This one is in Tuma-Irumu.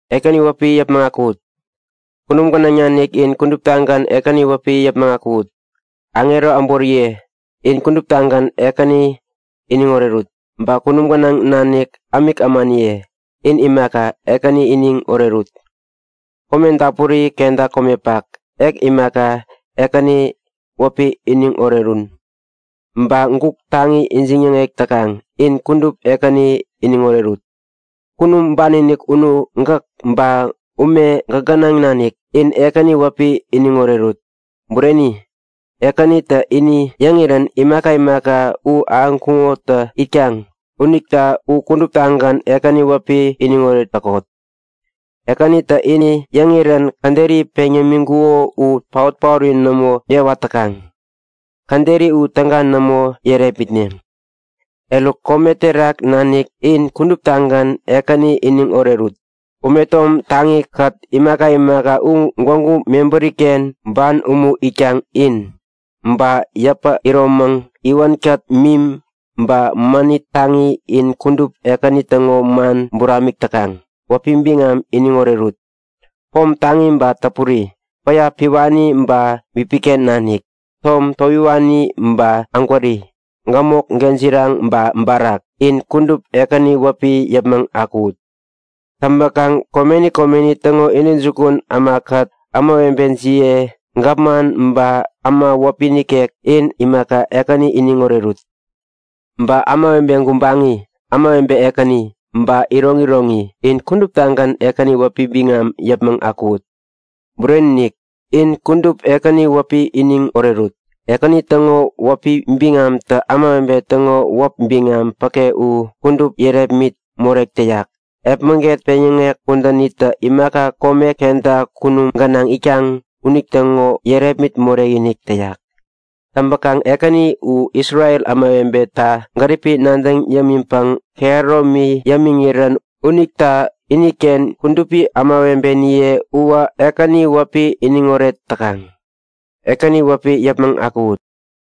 Ekäni wäpi yäpmäŋ akuwut! Kunum gänaŋ nanik in kuduptagän Ekäni wäpi yäpmäŋ akuwut. Aŋero äboriye in kuduptagän Ekäni iniŋ orerut. Ba kunum gänaŋ nanik ämik ämaniye in imaka, Ekäni iniŋ orerut! Edap dapuri kenta komepak ek imaka Ekäni wäpi iniŋ orerun! Ba guk taŋi ijiŋ-yäŋek täkaŋ in kudup Ekäni iniŋ orerut! Kunum ban-inik unu gäk, ba ume gäk gänaŋ nanik, in Ekäni wäpi iniŋ orerut. Bureni! Ekänitä ini yäŋirän imaka imaka u ahäŋkuŋotä itkaŋ unita u kuduptagän Ekäni wäpi iniŋoret täkot. Ekänitä ini yäŋirän käderi peŋ yämiŋkuko u paot-paori nämo yäwat täkaŋ. Käderi u täga nämo yärepmitneŋ. Eruk, kome terak nanik in kuduptagän Ekäni iniŋ orerut. Ume tom taŋikät imaka imaka u gwägu mebäriken ban umu itkaŋ in, Ba yäpä iromäŋ, iwänkät mim, ba mänit taŋi in kudup Ekäni täŋo man buramik täkaŋ, wäpi biŋam iniŋ orerut. Pom taŋi ba täpuri, päya piwani ba bipiken nanik, tom towiwani ba ägwäri, gämok, gejiraŋ ba barak, in kudup Ekäni wäpi yäpmäŋ akuwut. Täŋpäkaŋ komeni komeni täŋo intäjukun ämakät ämawebejiye, gapman ba äma wäpi nikek, in imaka, Ekäni iniŋ orerut. Ba ämawebe gubaŋi, ämawebe ekäni, ba iroŋiroŋi, in kuduptagän Ekäni wäpi biŋam yäpmäŋ akuwut! Bureni-inik, in kudup Ekäni wäpi iniŋ orerut. Ekäni täŋo wäpi biŋamtä ämawebe täŋo wäp biŋam päke u kudup yärepmit morek täyak. Epmäget peŋyäŋek kudänitä imaka kome kenta kunum gänaŋ itkaŋ unitäŋo yärepmit morekinik täyak! Täŋpäkaŋ Ekäni u Isrel ämawebeta gäripi nadäŋ yämiŋpäŋ kehäromi yämiŋirän unita iniken kudupi ämawebeniye uwä Ekäni wäpi iniŋoret täkaŋ. Ekäni wäpi yäpmäŋ akuwut!